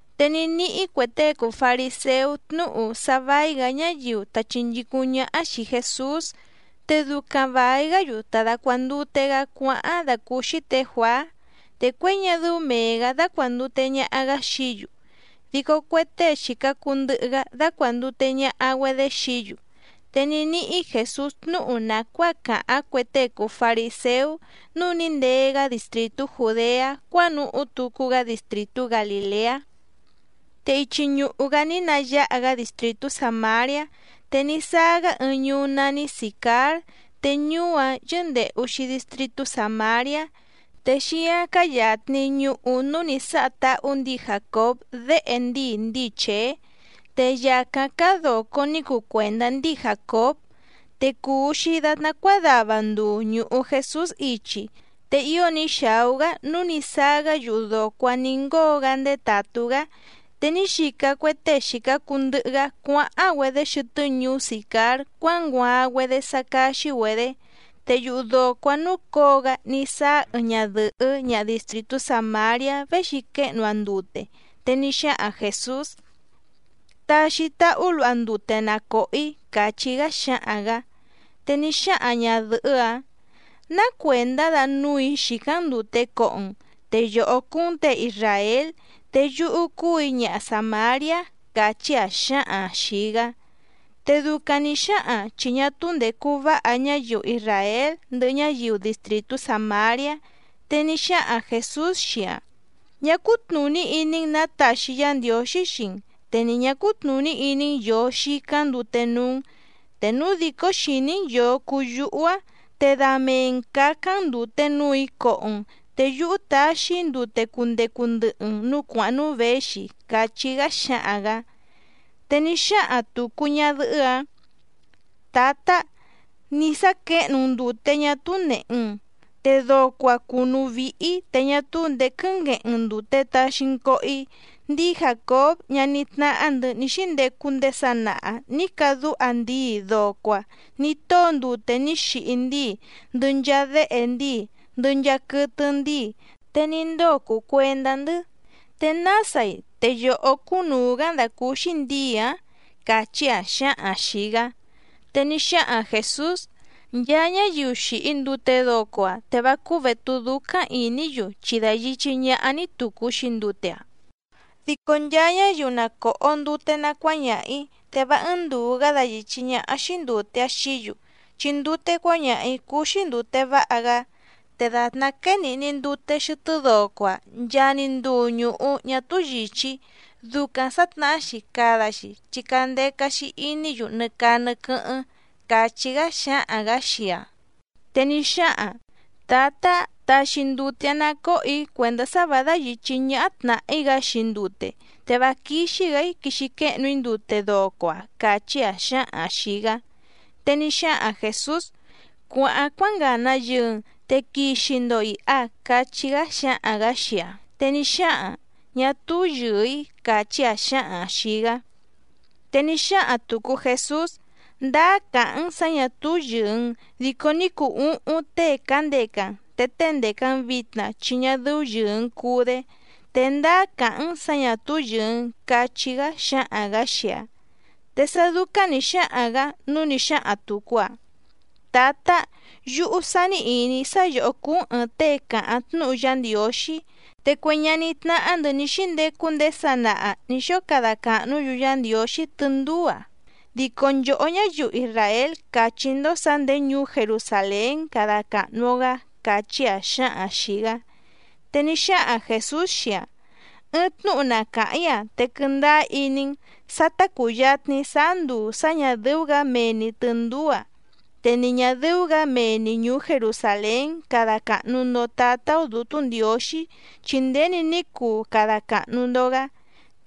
Te ní níhí cue tée cùu fariséú tnúhu sá vài‑gá ñáyiu ta chìnchícúⁿ ñáhá xìi Jesús. Te ducaⁿ vài‑gá‑yu ta dàcuandute‑gá cuáháⁿ dàcúúxí tě Juàá. Te cuěi ñá dɨ́ú mèe‑gá dácuàndute ñaha‑gá xií‑yu, dico cue tée xìca cuu ndɨhɨ‑gá dácuàndute ñaha‑güedé xií‑yu. Te ní níhí Jèsús tnúhu nàcuáa càháⁿ cue tée cùu fariséú, núu ní ndee‑gá distrìtú Jùdeá cuánuhú tucu‑gá distrìtú Galìleá. Te ichi ñùhu‑gá ní nayáha‑gá distrìtú Sàmariá. Te ní sáá‑gá ɨɨⁿ ñuú nání Sìcár te ñuú‑áⁿ yɨ́ndèhu‑xi distritú Sàmariá. Te xíáⁿ cáá yàtni ñuhu núú nǐ sáha táhú ndǐi Jàcób déhe ndíi ndíi Chèé. Te yàcáⁿ cáá dòco ní cuu cuèndá ndíi Jàcób. Te cùu‑xi datná cuádava nduu ñùhu Jesús ichi, te ío ní xàú‑gá nǔu ní sáá‑gá yuhu dòco‑áⁿ nǐ ngóo‑gá ndétàtú‑gá. Te ní xica cue tée xìca cuu ndɨhɨ‑gá cuáháⁿ‑güedé xɨtɨ́ ñuú Sìcár cuánguaaⁿ‑güedé sá cáxí‑güedě. Te yuhu dòco‑áⁿ núcǒo‑gá ní sáá ɨɨⁿ ñadɨ̀hɨ́ ñaha distrìtú Sàmariá véxi quéhnu‑aⁿ ndute, te ní xáhaⁿ Jèsús: —Taxi táhú luha ndute na còho‑í —càchí‑gá xáhaⁿ‑gǎ. Te ní xáhaⁿ ñàdɨhɨ́‑áⁿ: —¿Ná cuèndá da núù‑í xìcáⁿ‑n ndùte coho‑n? Te yòhó cúú‑n těe isràél, te yúhú cúù‑í ñaha Sàmariá —càchí‑aⁿ xǎhaⁿ‑aⁿ xìi‑gá. Te ducaⁿ nǐ xáhaⁿ‑aⁿ, chi ñá túú ndècu váha ñáyiu isràél ndɨhɨ ñáyiu distrìtú Sàmariá. Te ní xáhaⁿ Jèsús xii‑aⁿ: —Ñá cútnùní iní‑n nǎ taxi Yá Ndiǒxí xii‑n, te ni ñǎ cútnùní iní‑n yòo xicáⁿ ndute núú‑n. Te núu dìcó xìní‑n yòo cuu yúhú á, te da mee‑n cǎcáⁿ‑n ndùte núù‑í coho‑n, te yúhú taxi‑í ndute cundecu ndɨhɨ‑n nǔú cuàháⁿ núú věxi —càchí‑gá xáhaⁿ‑gǎ. Te ní xáhaⁿ tùcu ñadɨhɨ́‑áⁿ: —Tǎtá, nì sá quěhnu‑n ndùte ñá túú nèhe‑n, te doco‑a cùnú víhí, te ñá túú ndèé quɨ́ngueheⁿ‑n ndùte taxi‑n coho‑í. Ndíi Jàcób ñaní tnáhá‑ndɨ̌ ní xíndecu ndèé sanaha nǐ cadúha ndíi doco‑a nǐ tóo ndute ní xihi ndíi, ndɨhɨ nchaa déhe ndíi, ndɨhɨ nchaa quɨtɨ ndíi, te ní ndóo cùu cuendá‑ndɨ́. ¿Te násai, te yòhó cúnùu‑gá‑n dàcúúxí ndǐi‑ǎⁿ? —càchí‑aⁿ xǎhaⁿ‑aⁿ xìi‑gá. Te ní xáhaⁿ Jèsús: —Nchaa ñáyiu xìhi ndute doco‑a, te vá cúú větú dúcáⁿ ìní‑yu chi dayìchí ñáhá‑ní tùcu‑xi ndute‑a. Dico nchaa ñáyiu na còho ndute na cuáñaha‑ǐ, te vá ɨ́ɨ́ⁿ ndùu‑gá dayìchí ñáhá‑xí ndùte‑áⁿ xií‑yu, chi ndute cuáñaha‑ǐ cúú‑xí ndùte váha‑gá. Te dàtná quéé nìhni ndute xɨtɨ́ doco‑a, nchaa‑ni nduu ñùhu ñá túú yìchí, ducaⁿ sǎtnahá‑xi cada‑xi chi candeca‑xi iní‑yu nɨ caa nɨ quɨ́hɨ́ⁿ, te núu na còhó‑yu ndute cuáñaha yǔhú —càchí‑gá xáhaⁿ‑gǎ xii‑aⁿ. Te ní xáhaⁿ‑aⁿ: —Tǎtá, taxi ndute‑áⁿ ná còho‑í cuèndá sá vǎ dáyìchí ñáhá tnàhí‑gá‑xi ndute. Te vá quíxí‑gǎ‑í quixi quéhnu‑í ndute doco‑a —càchí‑aⁿ xǎhaⁿ‑aⁿ xìi‑gá. Te ní xáhaⁿ Jèsús: —Cuàháⁿ cuángàna yɨɨ‑n, te quixi‑ndo ìha —cachí‑gá xáhaⁿ‑gǎ xii‑aⁿ. Te ní xáhaⁿ‑aⁿ: —Ñá túú yɨ̀ɨ‑í —càchí‑aⁿ xǎhaⁿ‑aⁿ xìi‑gá. Te ní xáhaⁿ tùcu Jesús: —Ndáá càháⁿ‑n sǎ ñà túú yɨ̀ɨ‑n. Dico ní cuu úhúⁿ tée cǎndeca‑n, te tée ndèca‑n vitna chi ñá dɨ́ú yɨ̀ɨ‑n cuu‑dé, te ndáá càháⁿ‑n sǎ ñà túú yɨ̀ɨ‑n —cachí‑gá xáhaⁿ‑gǎ xii‑aⁿ. Te sá dúcáⁿ nǐ xáhaⁿ‑gǎ nǔu ní xáhaⁿ tùcu‑aⁿ: —Tǎtá, yúhú sání ìní‑í sá yòhó cúú‑n ɨ̀ɨⁿ tée càháⁿ tnúhu Yá Ndiǒxí. Te cue ñaní tnáhá‑ndɨ̌ ní xíndecu ndéé sanaha nǐ xóo cada càhnú‑yu Yá Ndiǒxí tɨndúú‑a, dico nchòhó ñáyiu isràél càchí‑ndó sǎ nděé ñuú Jerusàlén cada càhnu‑o‑gá —càchí‑aⁿ xǎhaⁿ‑aⁿ xìi‑gá. Te ní xáhaⁿ Jèsús xii‑aⁿ: —Ɨɨⁿ tnúhu na càháⁿ‑í‑a, te quɨndáá iní‑n. Sa ta cùyatni sáá nduu sá ñà dɨ́ú‑gǎ mee‑ni tɨ̀ndúú‑a, te ni ñà dɨ́ú‑gǎ mee‑ni ñùú Jerusàlén cada càhnu‑ndo Tátá‑ó Dǔtú Ndiǒxí, chi nděni ní cuu cada càhnu‑ndo‑gá.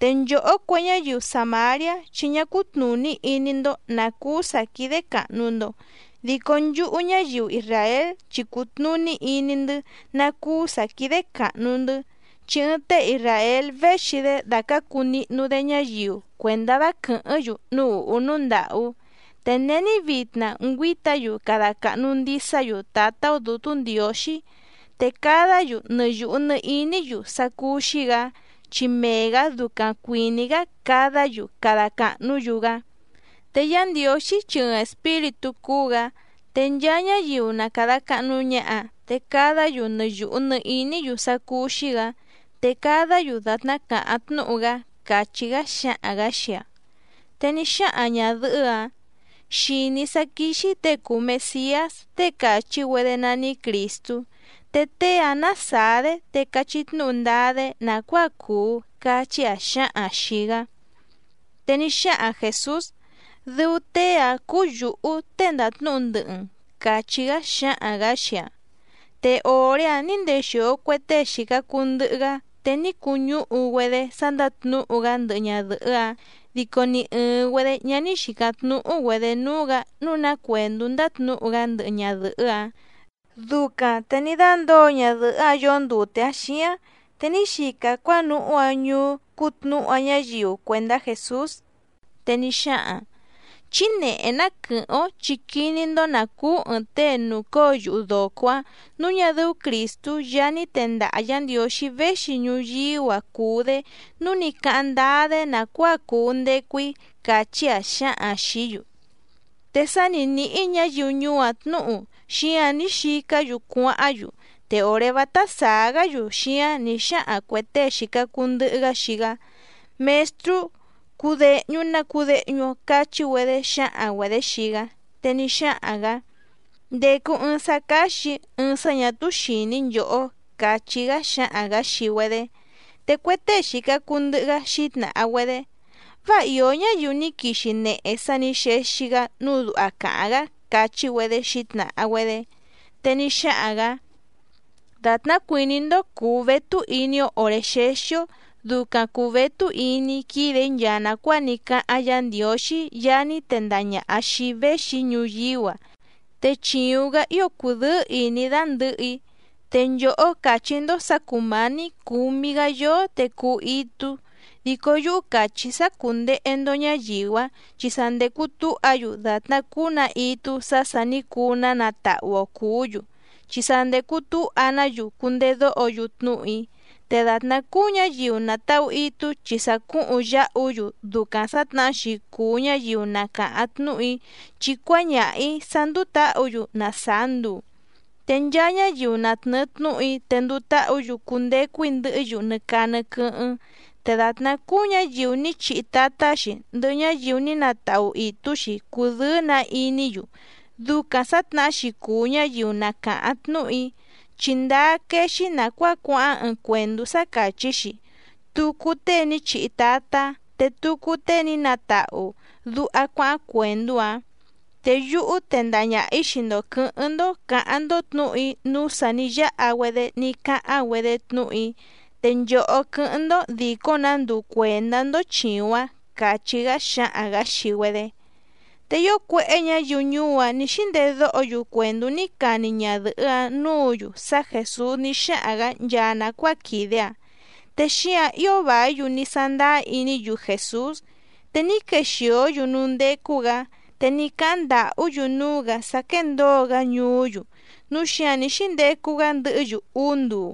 Te nchòhó cue ñáyiu Sàmariá chi ñá cútnùní iní‑ndó nǎ cúú sǎ quídé càhnu‑ndo, dico nchúhú ñáyiu isràél, chi cùtnuní iní‑ndɨ́ ná cúú sǎ quídé càhnu‑ndɨ́. Chi ɨɨⁿ tée isràél véxi‑dé dàcácu nihnu‑dé ñáyiu cuèndá vá quɨ̀hɨ́ⁿ‑yu núú ùhú núú ndàhú. Te není vitna ngüíta‑yu cada càhnu ndisá‑yu Tǎtá‑ó Dǔtú Ndiǒxí, te cadá‑yu nɨ yùhu nɨ iní‑yu sá cúú‑xí‑gǎ, chi mee‑gǎ ducaⁿ cuìní‑gá cadá‑yu cada càhnú‑yu‑gá. Te Yá Ndiǒxí chi ɨɨⁿ espíritú cúú‑gǎ. Te nchaa ñáyiu na càda cahnu ñaha, te cadá‑yu nɨ yùhu nɨ iní‑yu sá cúú‑xí‑gǎ te cadá‑yu dàtná càháⁿ tnúhu‑gá —càchí‑gá xáhaⁿ‑gǎ xii‑aⁿ. Te ní xáhaⁿ ñàdɨhɨ́‑áⁿ: —Xìní‑í sá quíxí těe cùu Mesiás, tée càchí‑güedé nání Crìstú. Te tée‑ǎⁿ ná sàá‑dé, te cachí tnúhu ndáá‑dé nàcuáa cuu —càchí‑aⁿ xǎhaⁿ‑aⁿ xìi‑gá. Te ní xáhaⁿ Jèsús: —Dɨu tée‑áⁿ cúú yǔhú tée ndàtnúhu ndɨhɨ‑n —càchí‑gá xáhaⁿ‑gǎ xii‑aⁿ. Te òré‑áⁿ nǐ ndexìo cue tée xìca cuu ndɨhɨ‑gá, te ní cuñúhu‑güedé sá ndátnǔhu‑gá ndɨhɨ ñadɨ̀hɨ́‑áⁿ. Dico ni ɨ̀ɨⁿ‑güedé ñá ní xìcáⁿ tnúhú‑güedě núú‑gǎ nǔu ná cuèndú ndátnǔhu‑gá ndɨhɨ ñadɨ̀hɨ́‑áⁿ. Ducaⁿ te ní dándǒo ñadɨ̀hɨ́‑áⁿ yoó ndute‑aⁿ xíáⁿ, te ní xica‑aⁿ cuánuhú‑aⁿ ñuú cútnǔhu‑aⁿ ñáyiu cuèndá Jèsús. Te ní xáhaⁿ‑aⁿ: —Chí nèhé ná quɨ̀hɨ́ⁿ‑ó, chi quiní‑ndó nǎ cúú ɨ̀ɨⁿ tée nùcóo yuhu dòco‑áⁿ nǔu ñá dɨ́ú Crìstú Yaá ní tendaha Yǎ Ndiǒxí véxi ñuyíú‑a cùu‑dé nǔu ní cáháⁿ ndáá‑dé nàcuáa cùu ndecu‑í —càchí‑aⁿ xǎhaⁿ‑aⁿ xìí‑yu. Te sá nǐ níhí ñǎyiu ñuú‑áⁿ tnǔhu, xíǎⁿ ní xicá‑yu cuáháⁿ‑yu. Te òré vátá sàá‑gá‑yu xíáⁿ nǐ xáhaⁿ cuè tée xìca cuu ndɨhɨ‑gá xii‑gá: —Mèstrú, cudèhñu na cudehñu‑o —cachí‑güedé xǎhaⁿ‑güedě xii‑gá. Te ní xáhaⁿ‑gǎ: —Ndècu ɨɨⁿ sá cáxì‑í, ɨɨⁿ sá ñà túú xìní nchòhó —càchí‑gá xáhaⁿ‑gǎ xii‑güedé. Te cue tée xìca cuu ndɨhɨ‑gá xǐtnàha‑güedé: —Váa ìó ñáyiu ní quixi nehe sá nǐ xexi‑gá nǔu duha càháⁿ‑gá —càchí‑güedé xǐtnàha‑güedé. Te ní xáhaⁿ‑gǎ: —Dàtná cuìní‑ndó cùu vétú iní‑ó òré xéxí‑ó, ducaⁿ cùu vétú iní‑í quídè‑í nchaa nàcuáa ní cáháⁿ Yǎ Ndiǒxí Yaá ní tendaha ñàha xii‑í véxi‑í ñuyíú‑a, te chìuⁿ‑gá ío cùdɨ́ɨ́ ìní‑í dandɨ̀hɨ‑í. Te nchòhó càchí‑ndó sǎ cùmání cǔmí‑gǎ yóó te cuu itú. Dico yúhú càchí‑í sá cùndehe‑ndo ñáyiu‑ǎⁿ, chi sa ndècu túha‑yu, dàtná cúú‑nǎ itú sá sà ní cuu‑ná natahu‑o cùú‑yu, chi sa ndècu túha‑ná‑yu cundedóho‑yu tnúhu‑í. Te dàtná cúú ñǎyiu nàtahu itú chi sa cúhuⁿ yáhu‑yu, ducaⁿ sǎtnahá‑xi cùu ñáyiu na càháⁿ tnúhu‑í, chi cuáñaha‑ǐ sá ndúú tǎhǔ‑yu na sàá nduu. Te nchaa ñáyiu na tnɨ̀ɨ tnúhu‑í te nduu táhǔ‑yu cundecu‑í ndɨhɨ́‑yu nɨ caa nɨ quɨ́hɨ́ⁿ. Te dàtná cúú ñǎyiu ní chihi tatá‑xi, ndɨhɨ ñáyiu ní natahu ìtú‑xi cùdɨ́ɨ́‑nǎ iní‑yu. Ducaⁿ sǎtnahá‑xi cùu ñáyiu na càháⁿ tnúhu‑í. Chi ndáá quéé‑xí nàcuáa cuáháⁿ ɨɨⁿ cuèndú sá càchí‑xi: “Tucu tée ní chihi tatá, te tucu tée ní natahu”, duha cuáháⁿ cuèndú‑áⁿ. Te yúhú tendaha ñaha‑ǐ xii‑ndo quɨ̌hɨ́ⁿ‑ndó cǎháⁿ‑ndó tnǔhu‑í núú sà ní yáha‑güedé ní cáháⁿ‑güedé tnúhu‑í. Te nchòhó quɨ́hɨ́ⁿ‑ndó dìcó‑nǎ nduu cuèndá‑ndó chìuⁿ‑áⁿ —càchí‑gá xáhaⁿ‑gǎ xii‑güedé. Te ío cuéhé ñǎyiu ñuú‑áⁿ nǐ xíndèdóho‑yu cuèndú ní cani ñadɨ̀hɨ́‑áⁿ nǔǔ‑yu sá Jèsús ní xáhaⁿ‑gǎ nchaa nàcuáa quìde‑aⁿ, te xíǎⁿ ío vàí‑yu ní sándáá iní‑yu Jèsús. Te ní quexìó‑yu núú ndécú‑gǎ, te ní cáháⁿ ndàhú‑yu núú‑gǎ sá quéndǒo‑gá ñuú‑yu, núu xíǎⁿ ní xíndecu‑gá ndɨhɨ́‑yu úú nduu.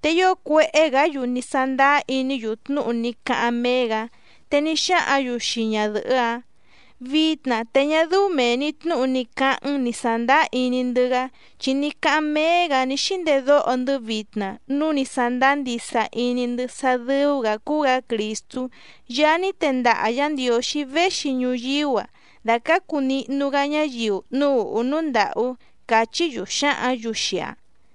Te ío cuéhé‑gǎ‑yu ní sándáá iní‑yu tnúhu ní cáháⁿ méé‑gǎ. Te ní xáhǎⁿ‑yu xii ñadɨ̀hɨ́‑áⁿ: —Vitna te ñá dɨ́ú mèe‑ni tnúhu ní cáháⁿ‑n ní sàndáá iní‑ndɨ́‑gá, chi ní cáháⁿ méé‑gǎ ní xíndedóho‑ndɨ́ vitna núu ní sándáá ndisa iní‑ndɨ́ sá dɨ́ú‑gǎ cúú‑gǎ Crìstú Yaá ní tendaha Yǎ Ndiǒxí véxi ñuyíú‑a dàcácu nihnu‑gá ñáyiu núú ùhú núú ndàhú —càchí‑yu xǎhǎⁿ‑yu xii‑aⁿ.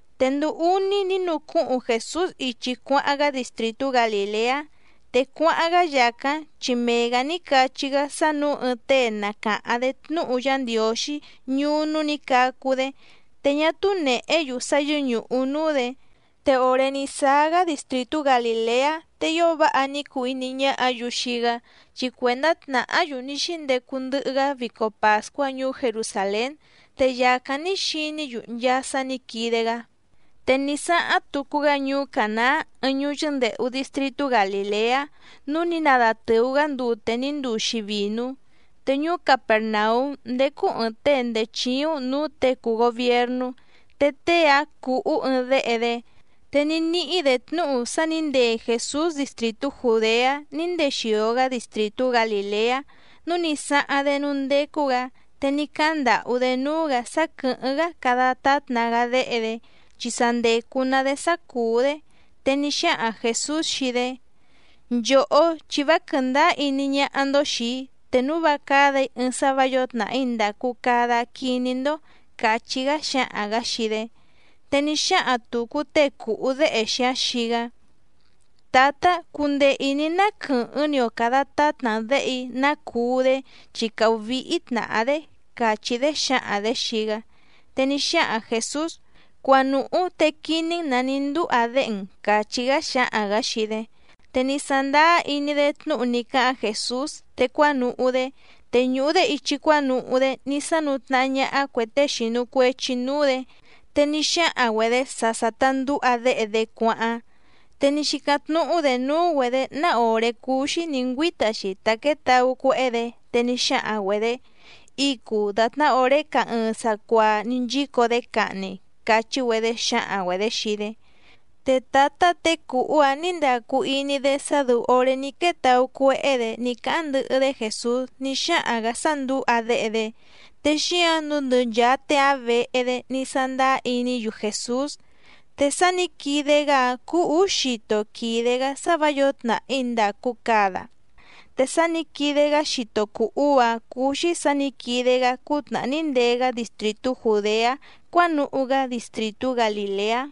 Te nduu úní ní nucúhuⁿ Jèsús ichi cuáháⁿ‑gá distrìtú Galìleá. Te cuáháⁿ‑gá yàcáⁿ, chi mee‑gǎ ní cachí‑gá sá nǔu ɨɨⁿ tée na càháⁿ‑dé tnúhu Yá Ndiǒxí ñuú núú nǐ cacu‑dé, te ñá túú nèhé‑yu sá yɨ́ñùhu núú‑dě. Te òré ní sáá‑gá distrìtú Galìleá, te ío váha ní cuu iní ñáhǎ‑yu xii‑gá, chi cuèndá tnàhá‑yu ní xíndecu ndɨhɨ‑gá vico pàscuá ñuú Jerusàlén. Te yàcáⁿ ní xiní‑yu nchaa sá nǐ quide‑gá. Te ní sáháⁿ tucu‑gá ñuú Cànaá ɨɨⁿ ñuú yɨ́ndèhu distritú Galìleá, núú nǐ nadatɨ̀u‑gá ndute ní nduu‑xi vìnú. Te ñuú Capèrnaúm ndécú ɨ̀ɨⁿ tée ndèé chíúⁿ nǔú těe cùu gobiernú, te tée‑áⁿ cùhú ɨɨⁿ déhe‑dé. Te ní níhí‑dě tnúhu sá nǐ ndee Jèsús distrìtú Jùdeá ní ndexìo‑gá distrìtú Galìleá, núu ní sáháⁿ‑dé núú ndécú‑gǎ, te ní cáháⁿ ndàhú‑dé núú‑gǎ sá quɨ̀hɨ́ⁿ‑gá cada tátna‑gá déhe‑dé, chi sa ndècu‑na‑dé sá cùú‑dé. Te ní xáhaⁿ Jèsús xii‑dé: —Nchòhó, chi vá quɨ̀ndáá iní ñáhá‑ndó xìi‑í te núu vá cádà‑í ɨɨⁿ sá vǎ yǒo tnàhí ndàcu cada quiní‑ndó —càchí‑gá xáhaⁿ‑gǎ xii‑dé. Te ní xáhaⁿ tùcu tée cùhú déhe‑xi‑áⁿ xii‑gá: —Tǎtá, cundee ìní‑n ná quɨ̀hɨ́ⁿ‑ni‑o càda tátna‑n děhe‑í ná cuu‑dé, chi càhú víhí tnàhá‑dé —càchí‑dé xǎhaⁿ‑dě xii‑gá. Te ní xáhaⁿ Jèsús: —Cuanùhú te quiní‑n nǎ ní ndúha déhe‑n —càchí‑gá xáhaⁿ‑gǎ xii‑dé. Te ní sándáá iní‑dé tnúhu ní cáháⁿ Jèsús, te cuánuhú‑dé. Te ñùhu‑dé ichi cuánuhú‑dé ní sánú tnàhá ñáhá cuè tée xìnu cuechi núú‑dě. Te ní xáhaⁿ‑güedě sá sà ta ndúha déhe‑dé cuáháⁿ. Te ní xícáⁿ tnúhú‑dě núú‑güedě ná òré cúú‑xí nǐ ngüíta‑xi ta quětaú cuéhé‑dě. Te ní xáhaⁿ‑güedě: —Icu dàtná òré caá ɨɨⁿ sacuaa ní nchíco‑dé cahni —càchí‑güedé xǎhaⁿ‑güedě xii‑dé. Te tǎtá těe cùhú‑áⁿ nǐ ndacu iní‑dé sá dɨ́ú òré ní quétaú cuéhé‑dě ní cáháⁿ ndɨhɨ‑dé Jèsús ní xáhaⁿ‑gǎ sá ndǔha déhe‑dé. Te xíǎⁿ nǔu ndɨ nchàa tée‑áⁿ vehe‑dé ní sándáá iní‑yu Jèsús. Te sá nǐ quide‑gá‑áⁿ cúú ǔú xito quìde‑gá sá vǎ yǒo tnàhí ndàcu cada. Te sá nǐ quide‑gá xito cùu uú‑áⁿ cúú‑xí sǎ nǐ quide‑gá cútnàhá ní ndee‑gá distrìtú Jùdeá cuánuhú‑gá distrìtú Galìleá.